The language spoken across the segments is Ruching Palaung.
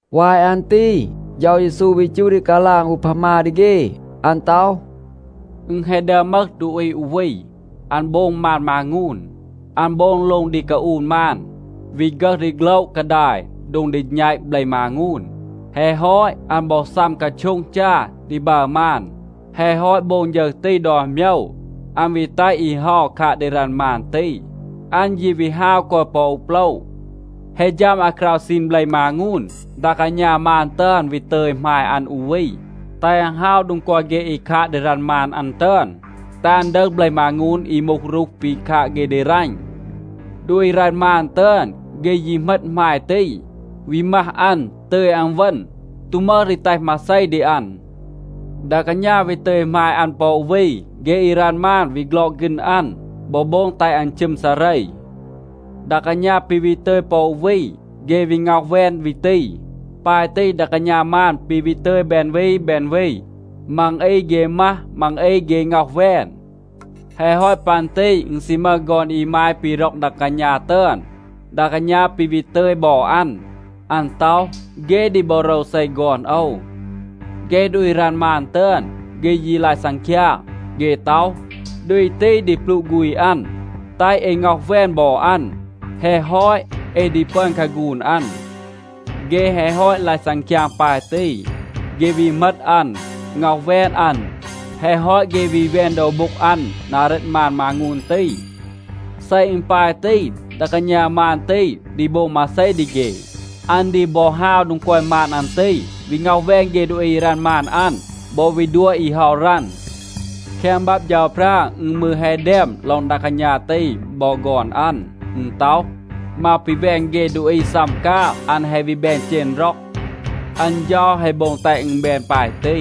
วาย อัน ตี เฌา เยซู วี จูห ดี กาลาง อูพามา ดี เฆ. อัน ต็อห, “อึณ แฮะ ดึอม มึห ดูอี อู วี, อัน โบง มาน มางูน. อัน โบง โล็ง ดี กาอูน มาน, วี ฆึห ดีโฆละ กาดาย โดง ดี แณต เบล มางูน. แฮะ ฮอต, อัน บอ ซัม กาโช็ง จา ดี บัร มาน. แฮะ ฮอต โบง ฌึร ตี ดอน โมยว, อัน วี แตห อี เฮา คาด ดี รัณ มาน ตี. อัน ยี วี ฮาว กอย ปอ อู โปละ. แฮะ ฌัม อาคราว ซีน เบล มางูน, ดา กาณา มาน ตึอน วี ตึย หมาย อัน อู วี, แตห อัน ฮาว โดง กอย เฆ อี คาด ดี รัณ มาน อัน ตึอน, แตห อัน ดึห เบล มางูน อี มูห รูห ปี คาด เฆ ดี รัณ. ดูอี รัณ มาน ตึอน, เฆ ยี เหมต หมาย ตี, วี มัห อัน, ตึย อัน เวณ, ตู มึห ดี แตห มาเซ ดี อัน. ดา กาณา วี ตึย หมาย อัน ปอ อู วี. เฆ อี รัณ มาน วี ฆลอก ฆีณ อัน, บอ โบง แตห อัน ชึม ซาเร. ดา กาณา ปี วี ตึย ปอ อู วี. เฆ วี ง็อห แวน วี ตี. ปาย ตี ดา กาณา มาน ปี วี ตึย แบน วี แบน วี. มัง อี เฆ มัห, มัง อี เฆ ง็อห แวน. แฮะ ฮอต ปัน ตี อึณ ซี มึห ฆอน อีมาย ปี ร็อก ดา กาณา ตึอน. ดา กาณา ปี วี ตึย บอ อัน. อัน ต็อห, ‘เฆ ดี บอ โรวเซ ฆอน โอว.’ เฆ ดูอี รัณ มาน ตึอน, เฆ ยี ลาย ซังคยาง. เฆ ต็อห, ‘ดูอี ตี ดี ปลูะ ฆูณ อัน. แตห เอ ง็อห แวน บอ อัน. แฮะ ฮอต, เอ ดี ปึอน คาฆูน อัน.’ เฆ แฮะ ฮอต ลาย ซังคยาง ปาย ตี, เฆ วี เหมต อัน, ง็อห แวน อัน. แฮะ ฮอต เฆ วี แวน โดว โบ็ง อัน นา เรต มาน มางูน ตี. เซ อึณ ปาย ตี, ดา กาณา มาน ตี ดี โบง มาเซ ดี เฆ? อัน ดี บอ ฮาว โดง กอย มาน อัน ตี, วี ง็อห แวน เฆ ดูอี อี รัณ มาน อัน บอ วี ดัว อี เฮา รัณ. แคง บับ เฌาพรา อึณ มืร แฮะ แดม ลอง ดา กาณา ตี บอ ฆอน อัน. อึณ ต็อห, ‘มาว ปี แวน เฆ ดูอี ซัม กาง, อัน แฮะ วี แบน เจณ ร็อง. อัน เฌา แฮะ โบง แตห อึณ แบน ปาย ตี.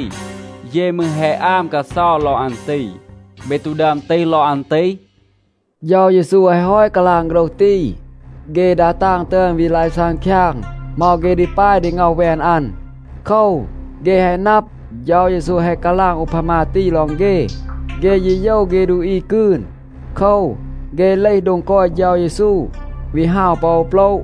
เย มืร แฮะ อาม กาเซา ลอง อัน ตี.’ เบ ตู ดึอม ตีห ลอง อัน ตี?” เฌา เยซู แฮะ ฮอต กาลาง โฆรห ตี, เฆ ดา ตาง ตึอน วี ลาย ซังคยาง เหมา เฆ ดี ปาย ดี ง็อห แวน อัน. โคว, เฆ แฮะ นับ, เฌา เยซู แฮะ กาลาง อูพามา ตี ลอง เฆ. เฆ ยี โยว เฆ ดูอี กืน. โคว, เฆ เลห โดง กอย เฌา เยซู, วี ฮาว ปอ โปละ.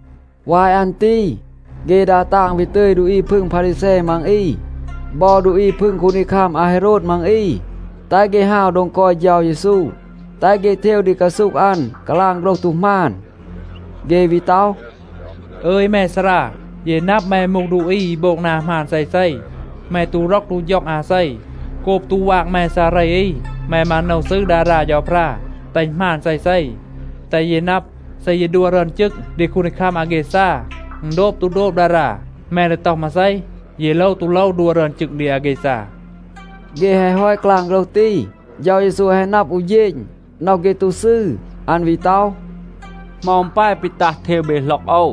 วาย อัน ตี เฆ ดา ตาง วี ตึย ดูอี พึง พารีแซ มัง อี บอ ดูอี พึง คูนดีคัม อาเฮโรด มัง อี, แตห เฆ ฮาว โดง กอย เฌา เยซู, แตห เฆ เทว ดี กาซูห อัน กาลาง โฆรห ตู หมาน. เฆ วี ต็อห, “อึย แม ซารา, เย นับ แม มูห ดูอี อี โบง นา หมาน เซเซ. แม ตู ร็อก ตู ฌ็อง อาเซ. โกบ ตู วาง แม ซาเร อี, แม มาโนว ซืร ดารา เฌาพรา, แตห อึณ หมาน เซเซ. แตห เย นับ, เซ เย ดัว รึอน จึง ดี คูนดีคัม อาแกซา, อึณ โดบ ตู โดบ ดารา? แม ดี ต็อห มาเซ? เย โลว ตู โลว ดัว รึอน จึง ดี อาแกซา?” เฆ แฮะ ฮอต กาลาง โฆรห ตี, เฌา เยซู แฮะ นับ อู เฌณ, น็อห เฆ ตู ซืร. อัน วี ต็อห, “เหมา อึณ ปาย ปี ตัห เทว เบ หล็อก โอว?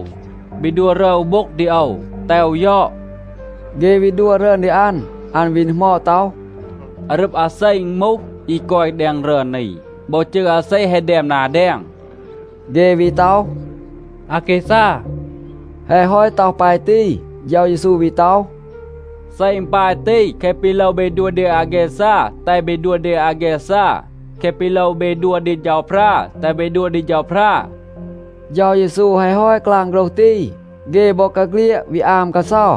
เบ ดัว รึอน อู โบ็ง ดี โอว, แตห โอว ยอด.” เฆ วี ดัว รึอน ดี อัน. อัน วี ดีหมอด ต็อห, “อารึบ อาเซ อึณ มูห, อี กอย แดง รึอน นี? บอ จืร อาเซ แฮะ แดม นา แดง?” เฆ วี ต็อห, “อาแกซา.” แฮะ ฮอต ต็อห ปาย ตี, เฌา เยซู วี ต็อห, “เซ อึณ ปาย ตี, แคะ ปี โลว เบ ดัว ดี อาแกซา แตห เบ ดัว ดี อาแกซา. แคะ ปี โลว เบ ดัว ดี เฌาพรา, แตห เบ ดัว ดี เฌาพรา.” เฌา เยซู แฮะ ฮอต กาลาง โฆรห ตี, เฆ บอกาเฆลียด วี อาม กาเซา.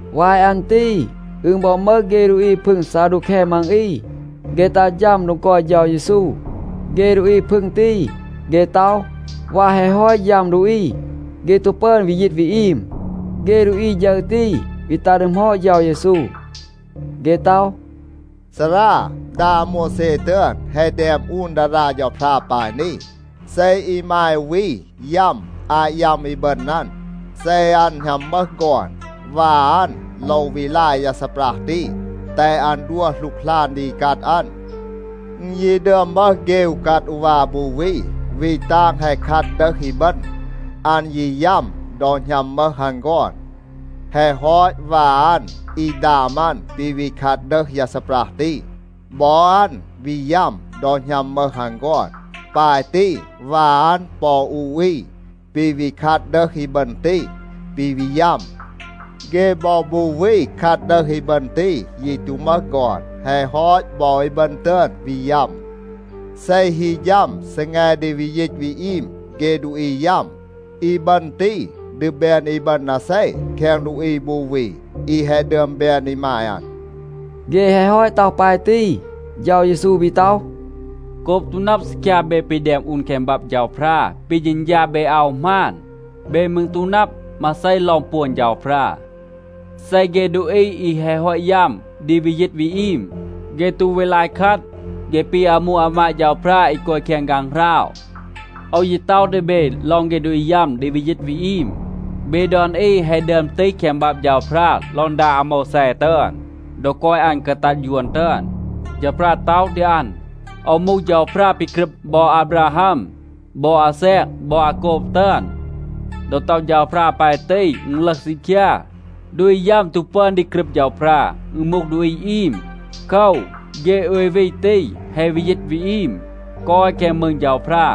วาย อัน ตี อึณ บอ มึห เฆ ดูอี พึง ซาดูแค มัง อี, เฆ ตัห ฌัม โดง กอย เฌา เยซู. เฆ ดูอี พึง ตี, เฆ ต็อห, วาย แฮะ ฮอต ยัม ดูอี, เฆ ตู ปึอน วี ยีต วี อีม. เฆ ดูอี ฌึร ตี วี ตัห ดีหมอด เฌา เยซู. เฆ ต็อห, “ซารา, ดา อาโมวแซ ตึอน แฮะ แดม อูน ดารา เฌาพรา ปาย นี, ‘เซ อีมาย อู วี ยัม อาต ยัม อีบึณ อัน, เซ อัน หณัม มึห ฆอน, วา อัน โลว วี ลาย ยา ซีปรัห ตี, แตห อัน ดัว หลูกหลาน ดี อีกัด อัน.’ อึณ ยี ดึอม มึห เฆ อูกัด อูวา บู วี. วี ตาง แฮะ คัด ดึห อีบึณ. อัน ยี ยัม ดอ หณัม มึห อัน ฆอน. แฮะ ฮอต วา อัน อี ดาม อัน ปี วี คัด ดึห ยา ซีปรัห ตี. บอ อัน วี ยัม ดอ หณัม มึห อัน ฆอน. ปาย ตี วา อัน ปอ อู อี ปี วี คัด ดึห อีบึณ ตี, ปี วี ยัม. เฆ บอ บู วี คัด ดึห อีบึณ ตี, ยี ตู มึห ฆอน. แฮะ ฮอต, บอ อีบึณ ตึอน วี ยัม. เซ ฮี ฌัม ซีแง ดี วี ยีต วี อีม เฆ ดูอี ยัม, อีบึณ ตี ดี แบน อีบึณ อาเซ แคง ดูอี บู วี, อี แฮะ ดึอม แบน อีมาย อัน?” เฆ แฮะ ฮอต ต็อห ปาย ตี, เฌา เยซู วี ต็อห, “โกบ ตู นับ ซีคยา เบ ปี แดม อูน แคง บับ เฌาพรา, ปี เฌณฌา เบ อาว หมาน. เบ มืร ตู นับ มาเซ ลอง ปวน เฌาพรา. เซ เฆ ดูอี อี แฮะ ฮอต ยัม ดี วี ยีต วี อีม, เฆ ตู วี ลาย คัด. เฆ ปี อามู อามาด เฌาพรา อี กอย แคง ฆางหราว. โอว ยี ต็อห ดี เบ ลอง เฆ ดูอี ยัม ดี วี ยีต วี อีม. เบ ดอน อี แฮะ ดึอม ตีห แคง บับ เฌาพรา ลอง ดา อาโมวแซ ตึอน. ดอ กอย อัน กาตัด ยวน ตึอน, เฌาพรา ต็อห ดี อัน, ‘โอว มูห เฌาพรา ปี กรึบ บอ อาบราฮัม, บอ อาแซก บอ อาโกบ ตึอน.’ ดอ ต็อห เฌาพรา ปาย ตี, อึณ ลึห ซีคยา, ดูอี ยัม ตู ปึอน ดี กรึบ เฌาพรา. อึณ มูห ดูอี อีม. โคว, เฆ โอย วี ตี แฮะ วี ยีต วี อีม, กอย แคง มืง เฌาพรา.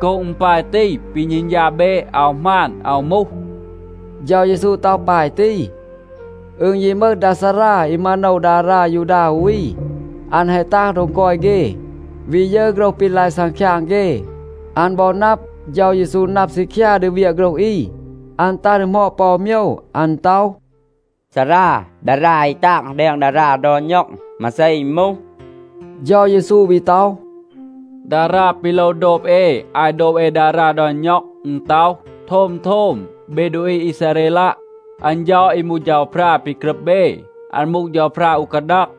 โกบ อึณ ปาย ตี, ปี เฌณฌา เบ อาว หมาน, อาว มูห.” เฌา เยซู ต็อห ปาย ตี. อึณ ยี มึห ดา ซารา อี มาโนว ดารา ยูดา อู วี, อัน แฮะ ตัห โดง กอย เฆ, วี ยึร โฆรห ปี ลาย ซังคยาง เฆ. อัน บอ นับ, เฌา เยซู นับ ซีคยา ดี เวียะ โฆรห อี. อัน ตัห ดีหมอด ปอ อู โมยว. อัน ต็อห, “ซารา, ดารา อี ตาง แดง ดารา ดอน ณ็อง, มาเซ อึณ มูห?” เฌา เยซู วี ต็อห, “ดารา ปี โลว โดบ เอ อาต โดบ เอ ดารา ดอน ณ็อง, อึณ ต็อห, ‘โทม, โทม, เบ ดูอี อีซาเรลัะ. อัน เฌา, อี มูห เฌาพรา ปี กรึบ เบ, อัน มูห เฌาพรา อู กาดัง.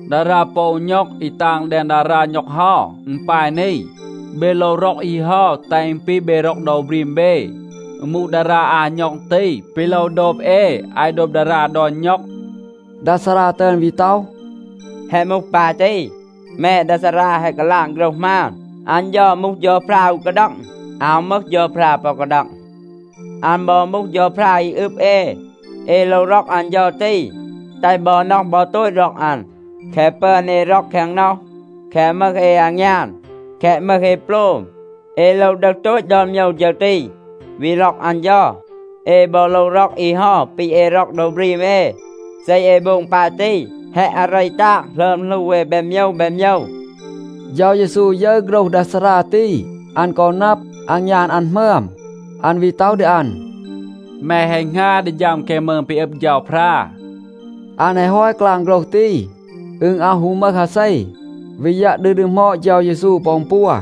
ดารา ปอ อู ณ็อง อี ตาง แดง ดารา ณ็อง เฮา, อึณ ปาย นี, ‘เบ โลว ร็อก อี เฮา, แตห อึณ ปี เบ ร็อก โดว บรีม เบ.’ อึณ มูห ดารา อา ณ็อง ตี, ปี โลว โดบ เอ อาต โดบ ดารา ดอน ณ็อง.” ดา ซารา ตึอน วี ต็อห, “แฮะ มูห ปาย ตี. แม ดา ซารา แฮะ กาลาง โฆรห หมาน. อัน เฌา มูห เฌาพรา อู กาดัง. อาว มึห เฌาพรา ปอ กาดัง. อัน บอ มูห เฌาพรา อี อึบ เอ. เอ โลว ร็อก อัน เฌา ตี, แตห บอ น็อห บอ โตต ร็อก อัน. แคะ ปึอน เอ ร็อก แคง น็อห, แคะ มึห เอ อางยาน, แคะ มึห เอ โปลม, เอ โลว ดึห โตต ดอน โมยว ฌึร ตี, วี ร็อก อัน เฌา. เอ บอ โลว ร็อก อี เฮา ปี เอ ร็อก โดว บรีม เอ. เซ เอ โบง ปาย ตี, แฮะ อาเร ตาง หลึอม หลู เอ แบน โมยว แบน โมยว.” เฌา เยซู ยึร โฆรห ดา ซารา ตี, อัน กอ นับ อางยาน อัน หมึอม. อัน วี ต็อห ดี อัน, “แม แฮะ หงา ดี ฌัม แคง มืง ปี อึบ เฌาพรา.” อัน แฮะ ฮอต กาลาง โฆรห ตี, อึณ อาว ฮู มึห อาเซ วี ยัะ ดี ดีหมอด เฌา เยซู ปอ อึณ ปัว.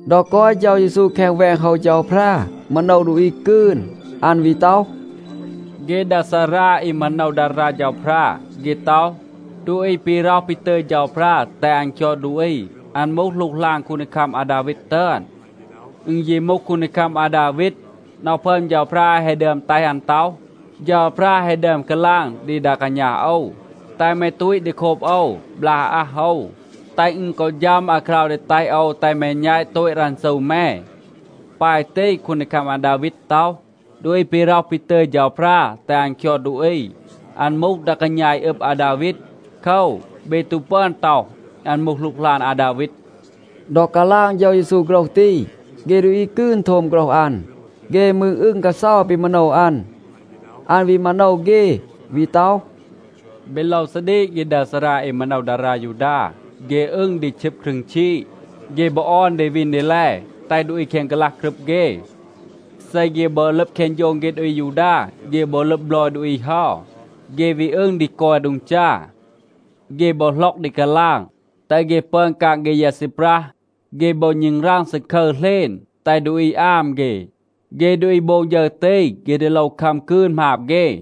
ดอ กอย เฌา เยซู แคง แวง โฮว เฌาพรา, มาโนว ดูอี กืน, อัน วี ต็อห, “เฆ ดา ซารา อี มาโนว ดารา เฌาพรา, เฆ ต็อห, ดูอี ปี ร็อห ปี ตึย เฌาพรา แตห อัน คยอด ดูอี, อัน มูห หลูกหลาน คูนดีคัม อาดาวีด ตึอน. อึณ ยี มูห คูนดีคัม อาดาวีด, น็อห พึอม เฌาพรา แฮะ ดึอม แตห อัน ต็อห, ‘เฌาพรา แฮะ ดึอม กาลาง ดี ดา กาณา โอว, แตห แม ตูต ดี โคบ โอว, บลาก อาอัห โอว, แตห อึณ กอ ฌัม อาคราว ดี แตห โอว แตห แม แณต โตต รันซู แม.’ ปาย ตี, คูนดีคัม อาดาวีด ต็อห, ‘ดูอี ปี ร็อห ปี ตึย เฌาพรา แตห อัน คยอด ดูอี, อัน มูห ดา กาณา อี อึบ อาดาวีด. โคว, เบ ตู ปึอน ต็อห, อัน มูห หลูกหลาน อาดาวีด.’” ดอ กาลาง เฌา เยซู โฆรห ตี, เฆ ดูอี กืน โทม โฆรห อัน, เฆ มืร อึง กาเซา ปี มาโนว อัน. อัน วี มาโนว เฆ, วี ต็อห, “เบ โลว ซาดีก เฆ ดา ซารา อี มาโนว ดารา ยูดา. เฆ อึง ดี ชึบ ครึง ชีด. เฆ บอ ออน ดี วีน ดี แล, แตห ดูอี แคง กาลัห กรึบ เฆ. เซ เฆ บอ ลึบ แคง โฌง เฆ ดูอี อายูดา, เฆ บอ ลึบ บลอย ดูอี เฮา, เฆ วี อึง ดี กอย โดง จา. เฆ บอ หล็อก ดี กาลาง, แตห เฆ ปึอน กาง เฆ ยา ซีปรัห. เฆ บอ ณึงราง ซาคึร เหลณ, แตห ดูอี อาม เฆ. เฆ ดูอี โบง ฌึร ตี, เฆ ดี โลว คัม กืน หมาบ เฆ.”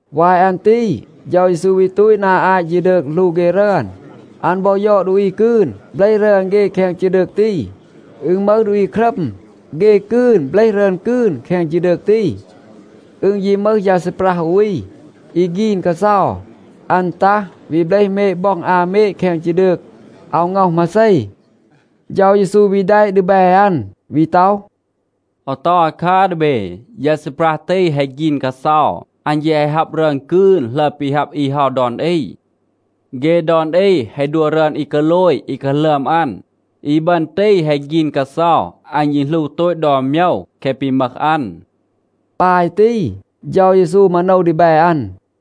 วาย อัน ตี เฌา เยซู วี ตูต นา อาต ฌีดืก หลู เฆ รึอน. อัน บอ ยอด ดูอี กืน เบลห รึอน เฆ แคง ฌีดืก ตี. อึณ มึห ดูอี ครัม, เฆ กืน เบลห รึอน กืน แคง ฌีดืก ตี. อึณ ยี มึห ยา ซีปรัห อู วี. อี ฆีน กาเซา. อัน ตัห, วี เบลห เมด บ็อง อา เมด แคง ฌีดืก. อาว ง็อห มาเซ. เฌา เยซู วี แดะ ดีแบ อัน, วี ต็อห, “โอว ต็อห อาคัร ดี เบ. ยา ซีปรัห ตี แฮะ ฆีน กาเซา. อัน แยะ แฮะ ฮับ รึอน กืน หลึอม ปี ฮับ อี เฮา ดอน อี. เฆ ดอน อี แฮะ ดัว รึอน อี กาโลย อี กาหลึอม อัน. อีบึณ ตี แฮะ ฆีน กาเซา. อัน ยี หลู โตต ดอน โมยว แคะ ปี มึห อัน.” ปาย ตี เฌา เยซู มาโนว ดีแบ อัน.